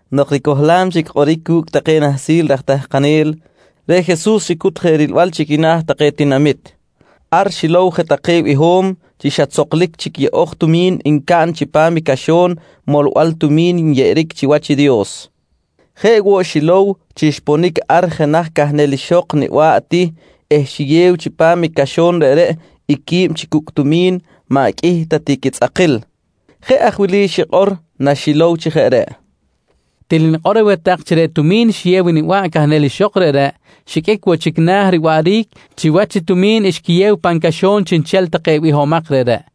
Nok ricohlam chic kꞌoric cu̱cꞌ take nahsil raj tahkanel, reꞌ Jesus xicut je rilbal chi quina̱ take tinamit. Ar xilow je take biho̱m chi xa tzohkil chic yeꞌo̱j tumi̱n ncaꞌn chipam caxo̱n molbal tumi̱n nyeꞌeric chiwach Dios. Jeꞌ woꞌ xilow chi xponic ar jenaj cahnel ixok niba̱ꞌ ti eh xiyew chipam i caxo̱n reꞌreꞌ i quib chi cucꞌ tumi̱n maꞌ qꞌuih ta ti quitzꞌakil. Jeꞌ aj wili xikꞌor naxilow chi jeꞌ reꞌ: «Til nikꞌor aweh tak chi reꞌ tumi̱n xiyew i niba̱ꞌ cahnel ixok reꞌreꞌ, xiqꞌuic woꞌ chic na̱ riwaꞌric chiwach i tumi̱n xquiyew pan caxo̱n chiꞌnchel take bihomak reꞌreꞌ,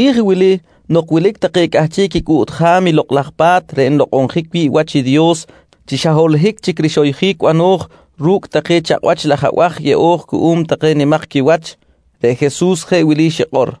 Chiri̱j wili nok wilic take cꞌahchiꞌ quicꞌuꞌtjam i Lokꞌ laj Pa̱t reꞌ nlokꞌonjic wi̱ꞌ wach i Dios chi xa holohic chic rixoyjic bano̱j ru̱cꞌ take chakꞌwach laj abaj yeꞌo̱j cuꞌum take nimak quiwach, reꞌ Jesus jeꞌ wili xikꞌor: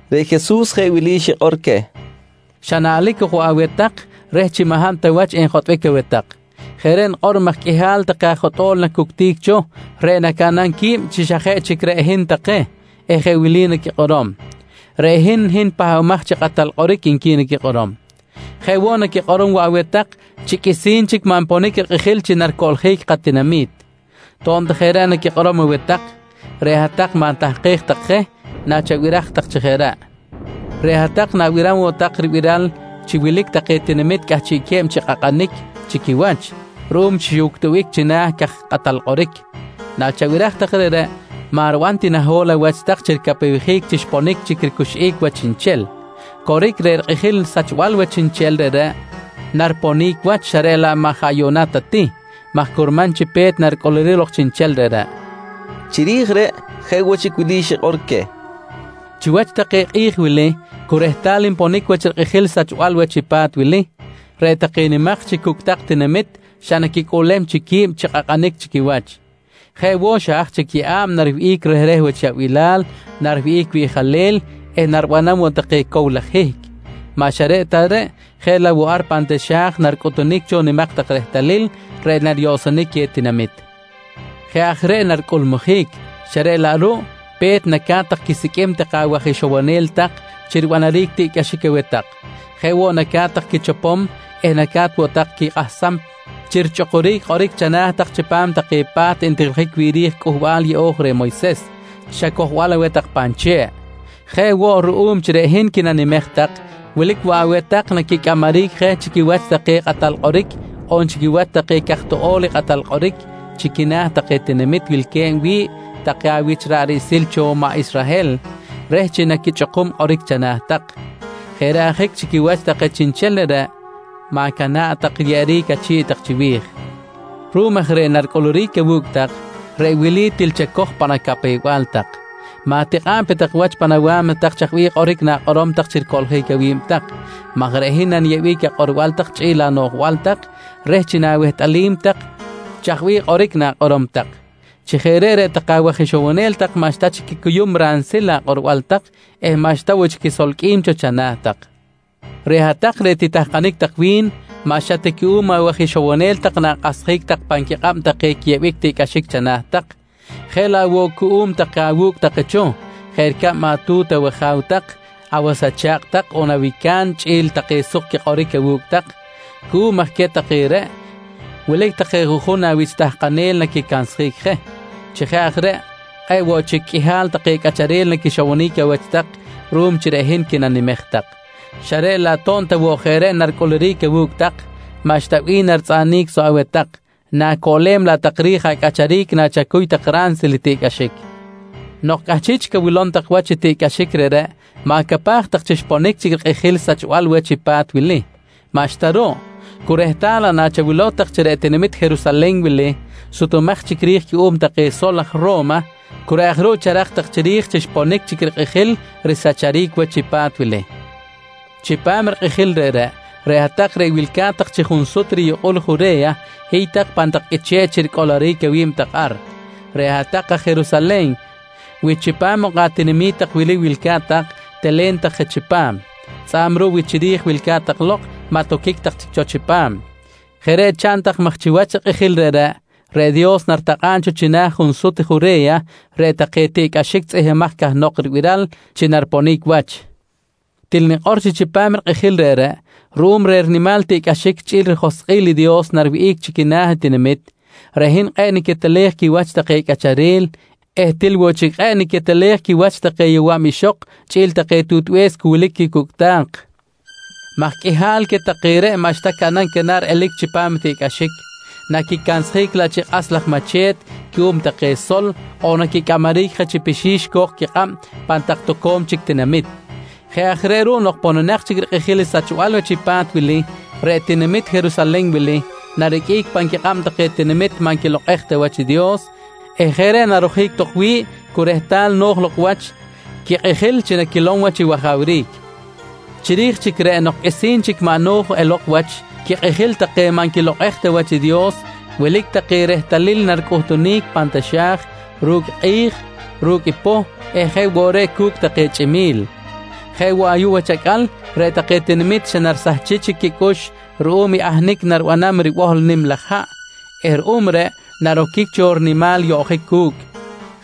Reꞌ Jesus jeꞌ wili xikꞌor queh: «Xa naꞌlic ok woꞌ aweh tak reh chi maꞌ hab ta wach enjotꞌbic aweh tak. Jeꞌ reꞌ nikꞌor maj qꞌuihal take aj jotꞌo̱l nacuctic cho reꞌ nacaꞌnam qui̱b chi xa jeꞌ chic reꞌ hin take eh jeꞌ wili naquikꞌorom: ‹Reꞌ hin, hin Pahbamaj chi Kꞌatal Kꞌoric, nqui naquikꞌorom. «Jeꞌ woꞌ naquikꞌorom woꞌ aweh tak chi qꞌuisi̱n chic maꞌ nponic rikꞌijil chi naricoꞌljic katinami̱t. To̱b ta jeꞌ reꞌ naquikꞌorom aweh tak, reꞌ hat-tak ma̱tahkej tak take je nachabiraj tak chi jeꞌ reꞌ. «Reꞌ hat-tak na̱biram woꞌ tak ribiral chi wilic take tinamit cꞌahchiꞌque̱b chi kꞌakꞌanic chi quiwach ruꞌum chi xiꞌuctubic china̱ caj kꞌatal kꞌoric. Nachabiraj tak reꞌreꞌ, maꞌ riban ti naho̱l awach tak chi ricapewjic chi xponic chic ricuxꞌic wach chiꞌnchel. Coric, reꞌ rikꞌijil sachbal wach chiꞌnchel reꞌreꞌ, nariponic wach xa reꞌ laꞌ maꞌ jaꞌ yuꞌna ta ti maj curman chi pe̱t naricꞌuluric lok chiꞌnchel reꞌreꞌ, nqui Jesus. Chiri̱j reꞌ jeꞌ woꞌ chic wili xikꞌor queh: «Chiwach take kꞌi̱j wili cu rehtal nponic wach rikꞌijil sachbal wach i pa̱t wili, reꞌ take nimak chi cucꞌtak tinamit xa naquicꞌuꞌlem chic qui̱b chi kꞌakꞌanic chi quiwach. Jeꞌ woꞌ xa haj chic yeꞌa̱b, nariwihꞌic rehreh wach yaꞌbilal, nariwihꞌic wiꞌjalel eh naribanam woꞌ take cow laj hihc. Maꞌ xa reꞌ ta reꞌ, jeꞌ laꞌ woꞌ ar pan taxa̱j naricꞌutunic cho nimak tak rehtalil reꞌ nariyoꞌsonic queh tinamit. Jeꞌ aj reꞌ naricꞌulmujic, xa reꞌ laꞌ ruꞌ pe̱t naca̱t tak quisiqꞌuim take awaj ixowonel tak chi ribanaric tiꞌcꞌaxic aweh tak. Jeꞌ woꞌ naca̱t tak quichopom eh naca̱t woꞌ tak quikꞌahsam chi richꞌukuric kꞌoric chana̱ tak chipam take pa̱t ntijiljic wi̱ꞌ ri̱j i Cꞌuhbal Yeꞌo̱j reh Moyses xa cojbal aweh tak pan che̱ꞌ. Jeꞌ woꞌ ruꞌum chi reꞌ hin quinanimej tak, wilic woꞌ aweh tak naquicꞌamaric je chi quiwach take kꞌatal kꞌoric on chi quiwach take caj toꞌo̱l chi kꞌatal kꞌoric chi quina̱ take tinamit wilque̱b wi̱ꞌ take awich rich ra̱ꞌ riꞌsil cho maꞌ Israhel reh chi naquichꞌukum kꞌoric chana̱ tak. Jeꞌ reꞌ ajic chi quiwach aj chiꞌnchel reꞌreꞌ ma̱cana̱ꞌ tak riyeꞌeric achi̱ꞌ tak chiwi̱j. Ruꞌum aj reh naricꞌuluric awu̱cꞌ tak, reꞌ wili til chacoj pan acapew-bal tak: Ma̱tikꞌa̱ꞌ pe tak wach pan awa̱mna tak chaj bih kꞌoric na̱kꞌorom tak chi ricoꞌljic awi̱b tak maj reꞌ hin naniyeꞌbic akꞌorbal tak chꞌi̱l anoꞌjbal tak reh chi na̱wehtꞌalim tak chaj bih kꞌoric na̱kꞌorom tak. Chi jeꞌ reꞌ, reꞌ take awaj ixowonel maꞌxta chic quicuyum ransil akꞌorbal tak eh maꞌxta woꞌ chic quisolqꞌuim cho chana̱ tak. «Reꞌ hat-tak reꞌ titahkanic tak wi̱n, maꞌ xa cuꞌum ta awaj ixowonel na̱kꞌahsjic tak pan quikꞌab take aj yeꞌol tiꞌcꞌaxic china̱ tak, jeꞌ laꞌ woꞌ cuꞌum take awu̱cꞌ take cho, jeꞌ ricab atu̱t awaja̱w tak, awas acha̱kꞌ tak on awica̱n chꞌi̱l take suk quikꞌoric awu̱cꞌ tak. Cuꞌum aj queh take reꞌ, wilic take juꞌjun awich tahkanel naquicansjic je. Chi jeꞌ aj reꞌ kꞌe̱ꞌ woꞌ chic qꞌuihal take cꞌacharel naquixowonic awach tak ruꞌum chi reꞌ hin quinanimej tak, xa reꞌ laꞌ to̱b ta woꞌ jeꞌ reꞌ naricꞌuluric awu̱cꞌ tak, maꞌxta bih naritzꞌaꞌnic soꞌ aweh tak, na̱coꞌlem laꞌ tak ri̱j acꞌacharic nachacuy tak ransil i tiꞌcꞌaxic. «Nok cꞌahchiꞌ chic awilom tak wach tiꞌcꞌaxic reꞌreꞌ, ma̱capaj tak chi xponic chic rikꞌijil i sachbal wach i pa̱t wili. Maꞌxta ruꞌ, cu rehtal laꞌ nachawilow tak chi reꞌ tinamit Jerusalen wili sutumaj chic ri̱j cuꞌum take sol aj Ro̱ma, cu reꞌ aj ruꞌ charak tak chiri̱j chi xponic chic i rikꞌijil risacharic wach i pa̱t wili. Chipam rikꞌijil reꞌreꞌ, reꞌ hat-tak reꞌ wilca̱t tak chi junsut riyukꞌul Jure̱ya hiy tak pan tak qꞌuiche̱ꞌ chi ricꞌoloric awi̱b tak ar. Reꞌ hat-tak aj Jerusalen wi chipam ok atinami̱t tak wili wilca̱t tak, telen tak je chipam. Tzꞌa̱b ruꞌ wi chiri̱j wilca̱t tak lok, maꞌ toquic tak chic cho chipam. Jeꞌ reꞌ chaꞌn tak maj chiwach rikꞌijil reꞌreꞌ, reꞌ Dios naritakꞌa̱b cho china̱ junsut Jure̱ya reꞌ take tiꞌcꞌaxic tzꞌihmbimaj cahnok ribiral chi nariponic wach. Til nikꞌor chi chipam rikꞌijil reꞌreꞌ, ruꞌum reh rinimal tiꞌcꞌaxic chꞌi̱l rijoskꞌil i Dios nariwihꞌic chi quina̱ i tinamit, reꞌ hin kꞌe̱ꞌ niquetelej quiwach take cꞌacharel eh til woꞌ chic kꞌe̱ꞌ niquetelej quiwach take yowa̱b ixok chꞌi̱l take tutbe̱s cu wilic quicucꞌta̱k, maj qꞌuihal queh take reꞌ maꞌxta caꞌnam canar elic chipam i tiꞌcꞌaxic, naquicansjic laꞌ chi kꞌas laj mache̱t cuꞌum take sol on naquicꞌamaric je chi pixi̱x co̱k quikꞌab pan tak toco̱m chic tinamit. Jeꞌ aj reꞌ ruꞌ nok pononak chic rikꞌijil i sachbal wach i pa̱t wili, reꞌ tinamit Jerusalen wili nariqꞌuic pan quikꞌab take tinamit maꞌ nquilokꞌej ta wach i Dios eh jeꞌ reꞌ narojic tok wi̱ꞌ cu rehtal no̱j lok wach quikꞌijil chi naquilom wach i wajawric. «Chiri̱j chic reꞌ nok qꞌuisi̱n chic maꞌ no̱j elok wach quikꞌijil take maꞌ nquilokꞌej ta wach i Dios, wilic take rehtalil naricꞌuhtunic pan taxa̱j ru̱cꞌ i kꞌi̱j, ru̱cꞌ i poh eh jeꞌ woꞌ reꞌ cu̱cꞌ take chꞌimi̱l. Jeꞌ woꞌ ayuꞌ wach acꞌal reꞌ take tinamit xa narisahchic chic quicꞌux ruꞌum i ahnic naribanam i ribohl nim laj haꞌ eh ruꞌum reꞌ, naroquic cho rinimal yoꞌjic cu̱cꞌ.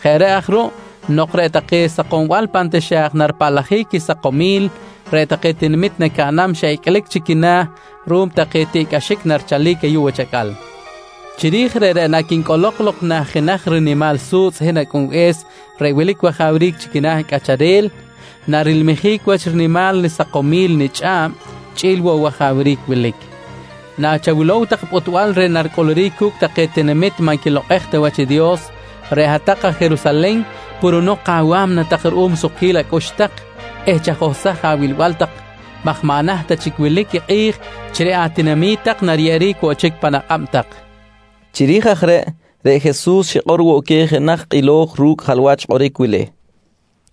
Jeꞌ aj reꞌ ruꞌ nok reꞌ take sakombal pan taxa̱j naripaꞌlajic quisakomil, reꞌ take tinamit nacaꞌnam xa icꞌlic chic quina̱ ruꞌum take tiꞌcꞌaxic narichalic ayuꞌ wach acꞌal. Chiri̱j reꞌreꞌ naquincꞌolok lok nah jenaj rinimal su̱tzꞌ i hin Acꞌunbe̱s reꞌ wilic wajawric chi quina̱ cꞌacharel, narilmijic wach rinimal risakomil nichꞌa̱b chꞌi̱l woꞌ i wajawric wilic. Nachawilow tak i pꞌutbal reh i naricꞌuluric cu̱cꞌ take tinamit maꞌ nquilokꞌej ta wach i Dios, reꞌ hat-tak aj Jerusalen purunok awa̱mna tak ruꞌum sukquil acꞌux tak eh chajohsaj awilbal tak maj maꞌ naht ta chic wilic i kꞌi̱j chi reꞌ atinami̱t tak nariyeꞌeric woꞌ chic pan akꞌab tak, nqui queh. Chiri̱j aj reꞌ, reꞌ Jesus xikꞌor woꞌ queh jenaj kꞌilo̱j ru̱cꞌ jalwach kꞌoric wili: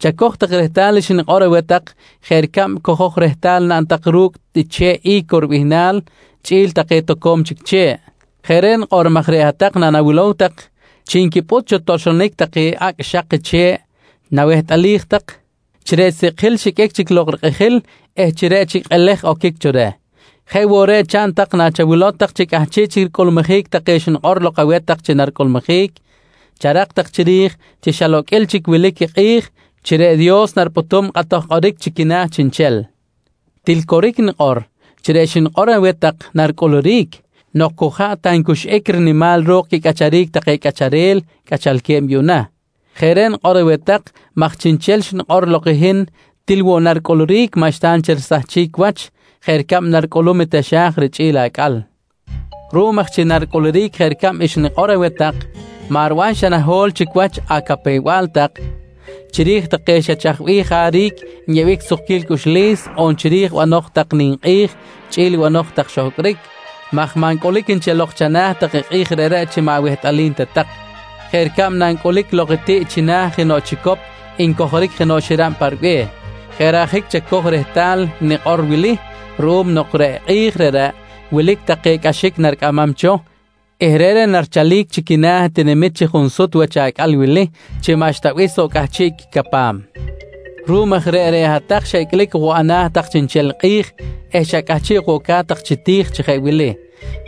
«Chacoj tak rehtal xnikꞌor aweh tak jeꞌ ricab cojo̱j rehtal naꞌn tak ru̱cꞌ i che̱ꞌ I̱co ribihnal chꞌi̱l take toco̱m chic che̱ꞌ. Jeꞌ reꞌ nikꞌor maj reꞌ hat-tak nanawilow tak chi nquipꞌut cho toxlonic take acꞌ xak che̱ꞌ, nawehtꞌalij tak chi reꞌ sikꞌjil xiqꞌuic chic lok rikꞌijil eh chi reꞌ chic kꞌelej oquic cho reh. Jeꞌ woꞌ reꞌ chaꞌn tak chi nachawilow tak chi cꞌahchiꞌ chic ricꞌulmujic take xnikꞌor lok aweh tak chi naricꞌulmujic, charak tak chiri̱j chi xa loqꞌuil chic wilic i kꞌi̱j chi reꞌ Dios naripꞌutum kꞌatoj kꞌoric chi quina̱ chiꞌnchel. Til coric nikꞌor chi reꞌ xnikꞌor aweh tak naricꞌuluric nok cu jaꞌ ta ncuxꞌic rinimal ro̱k quicꞌacharic take cꞌacharel cꞌachalque̱b yuꞌna. Jeꞌ reꞌ nikꞌor aweh tak maj chiꞌnchel reꞌ xnikꞌor lok i hin, til woꞌ naricꞌuluric maꞌxta nchel risahchic wach jeꞌ ricab naricꞌulum i taxa̱j richꞌi̱l i acꞌal. «Ruꞌum aj chi naricꞌuluric jeꞌ ricab xnikꞌor aweh tak, maꞌ riban xa naho̱l chic wach acapew-bal tak chiri̱j take xa chaj bih jaric nyeꞌbic sukquil cꞌuxlis on chiri̱j banoj tak ninkꞌi̱j chꞌi̱l banoj tak xohcꞌric maj maꞌ ncꞌulic nchel lok chana̱ tak i kꞌi̱j reꞌreꞌ chi maꞌ awehtꞌalim ta tak jeꞌ ricab nancꞌulic lok i tiꞌ china̱ jenoꞌ chicop ncojoric jenoꞌ xirab pa ribe̱h. Jeꞌ reꞌ ajic chacoj rehtal i nikꞌor wili ruꞌum nok reꞌ kꞌi̱j reꞌreꞌ, wilic take cꞌaxic naricꞌamam cho eh reꞌreꞌ narichalic chi quina̱ tinamit chi junsut wach acꞌal wili chi maꞌxta bih soꞌ cꞌahchiꞌ quicapam. Ruꞌum aj reꞌ, reꞌ hat-tak xa icꞌlic ok woꞌ ana̱ tak chiꞌnchel kꞌi̱j eh xa cꞌahchiꞌ ok woꞌ ca̱t tak chi ti̱j chi jeꞌ wili: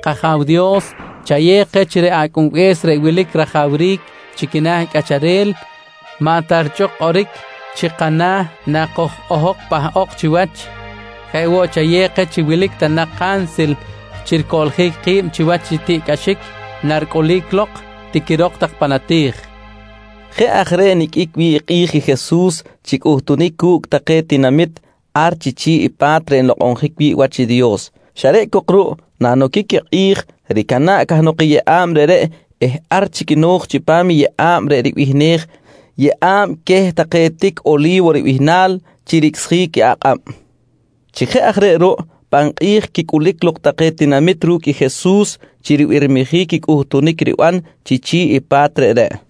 ‹K-Aja̱w Dios, chayew keh chi reꞌ Acꞌunbe̱s reꞌ wilic rajawric chi quina̱ cꞌacharel maꞌ ta richꞌuk kꞌoric chi kana̱ nakoj-ojok pahꞌok chiwach. Jeꞌ woꞌ, chayew keh chi wilic ta nak kansil chi ricoꞌljic ki̱b chiwach i tiꞌcꞌaxic naricꞌulic lok, tiquirok tak pan ati̱j, nqui Jesus queh take raj tahkanel. Jeꞌ aj reꞌ niqꞌuic wi̱ꞌ kꞌi̱j i Jesus chi cꞌuhtunic cu̱cꞌ take tinamit ar chi chi̱ꞌ i pa̱t reꞌ nlokꞌonjic wi̱ꞌ wach i Dios xa reꞌ cok ruꞌ nanoquic i kꞌi̱j, ricana̱ꞌ cahnok i yeꞌa̱b reꞌreꞌ eh ar chic no̱j chipam i yeꞌa̱b reꞌ ribihnej “Yeꞌa̱b queh take tic Oli̱wo ribihnal” chi ricꞌsjic i akꞌab. Chi jeꞌ aj reꞌ ruꞌ, pan kꞌi̱j quicꞌulic lok take tinamit ru̱cꞌ i Jesus chi ribirmijic i cꞌuhtunic riban chi chi̱ꞌ i pa̱t reꞌreꞌ.